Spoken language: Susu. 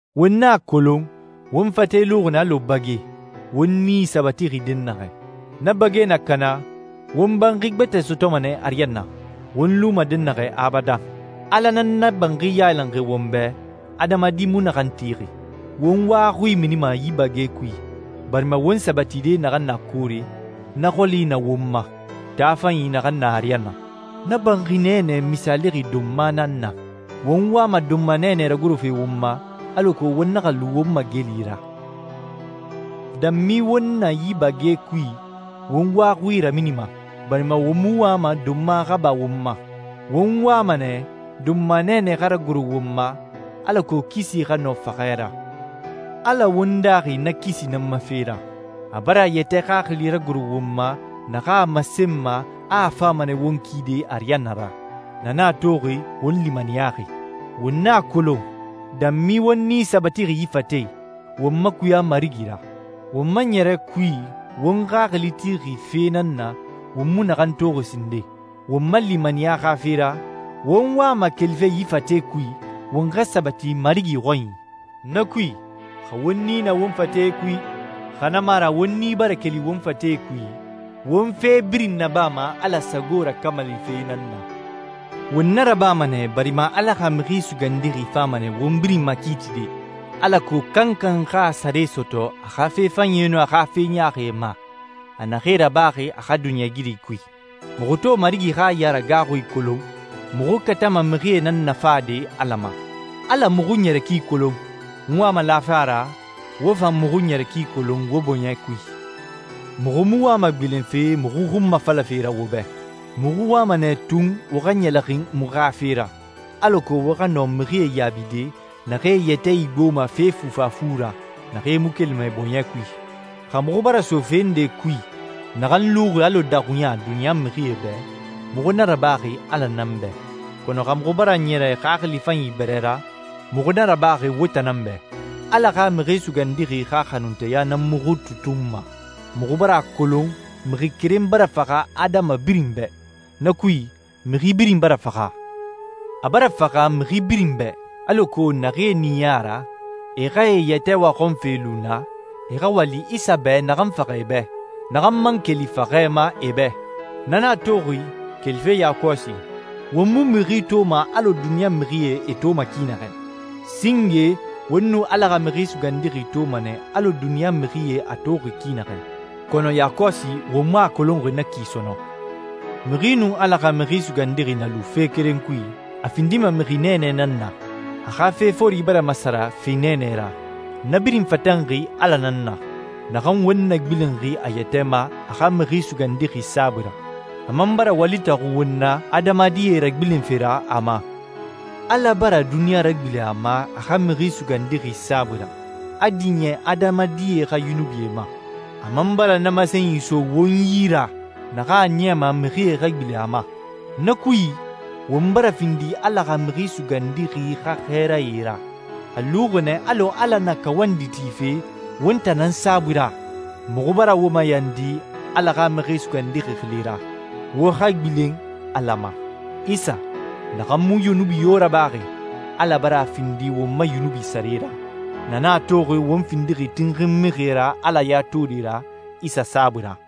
Won a kolon, won fate luxi nɛ alɔ bage, won nii sabatixi dɛnnaxɛ. Na bage na kana, won banxi gbɛtɛ sɔtɔma nɛ ariyanna, won luma dɛnnaxɛ abadan. Ala nan na banxi yailanxi won bɛ, adamadi mu naxan tixi. Won wa xui minima yi bage kui, barima won sabatide naxan na koore, na xɔli na won ma, taa fanyi naxan na ariyanna. Na banxi nɛɛnɛ misaalixi donma nan na. Won wama donma nɛɛnɛ ragorofe won ma, alako won naxa lu won mageli ra. Danmi won na yi bage kui, won wa xui raminima, barima won mu wama donma xa ba won ma. Won wama nɛ donma nɛɛnɛ xa ragoro won ma, alako kisi xa nɔ faxɛ ra. Ala won daaxi na kisi nan ma fe ra. A bara a yɛtɛ Xaxili ragoro won ma naxan a masenma a fama nɛ won kide ariyanna ra. Na nan a toxi won limaniyaxi. Won a kolon, danmi won nii sabatixi yi fate i, won makuya Marigi ra. Won ma ɲɛrɛ kui won xaxili tixi fe nan na won mu naxan toxi sinden. Won ma limaniya xa fe ra, won wama kelife yi fate kui, won xa sabati Marigi xɔnyi. Na kui, xa won nii na won fate kui, xa na mu a ra won nii bara keli won fate kui, won fe birin nabama Ala sago rakamalife nan na. Won na rabama nɛ barima Ala xa Mixi Sugandixi fama nɛ won birin makiitide, alako kankan xa a sare sɔtɔ a xa fe fanyie nun a xa fe ɲaaxie ma, a naxee rabaxi a xa duniɲɛigiri kui. Muxu to Marigi xa yaragaaxui kolon, muxu katama mixie nan nafade Ala ma. Ala muxu ɲɛrɛ ki kolon. N wama lafe a ra, wo fan muxu ɲɛrɛ ki kolon wo bɔɲɛ kui. Muxu mu wama gbilenfe muxu xunmafalafe ra wo bɛ. Muxu wama nɛ tun wo xa ɲɛlɛxin muxu xa fe ra, alako wo xa nɔ mixie yaabide naxee e yɛtɛ igboma fee fufafu ra, naxee mu kelima e bɔɲɛ kui. Xa muxu bara so fe ndee kui naxan luxi alɔ daxuɲa duniɲa mixie bɛ, muxu na rabaxi Ala nan bɛ. Kɔnɔ xa muxu bara ɲɛrɛ xaxili fanyi bɛrɛ ra, muxu na rabaxi wo tan nan bɛ. Ala xa Mixi Sugandixi xa xanunteya nan muxu tutunma. Muxu bara a kolon mixi keren bara faxa adama birin bɛ. Na kui, mixi birin bara faxa. A bara faxamixi birin bɛ, alako naxee ɲiɲɛ a ra e xa e yɛtɛ waxɔnfe lu na, e xa wali Isa bɛ naxan faxa e bɛ, naxan man keli faxɛ ma e bɛ. Na nan a toxi, kelife yakɔsi, won mu mixi toma alɔ duniɲa mixie e toma ki naxɛ. Singe won nu Ala xa Mixi Sugandixi toma nɛ alɔ duniɲa mixie a toxi ki naxɛ, kɔnɔ yakɔsi won mu a kolonxi na ki sɔnɔn. Mixi nun Ala xa Mixi Sugandixi na lu fe keren kui, a findima mixi nɛɛnɛ nan na. A xa fe fori bara masara fe nɛɛnɛ ra. Na birin fatanxi Ala nan na, naxan won nagbilenxi a yɛtɛ ma a xa Mixi Sugandixi saabui ra. A man bara wali taxu won na adamadie ragbilenfe ra a ma. Ala bara duniɲa ragbilen a ma a xa Mixi Sugandixi saabui ra, a diɲɛ adamadie xa yunubie ma. A man bara na masenyi so won yi ra naxan a niyama mixie xa gbilen a ma. Na kui, won bara findi Ala xa Mixi Sugandixi xa xɛɛrae ra. A luxi nɛ alɔ Ala na kawandi tife won tan nan saabui ra. Muxu bara wo mayandi Ala xa Mixi Sugandixi xili ra, wo xa gbilen Ala ma. Isa naxan mu yunubi yo rabaxi, Ala bara a findi won ma yunubi sare ra. Na nan a toxi won findixi tinxin mixie ra Ala ya tode ra Isa saabui ra.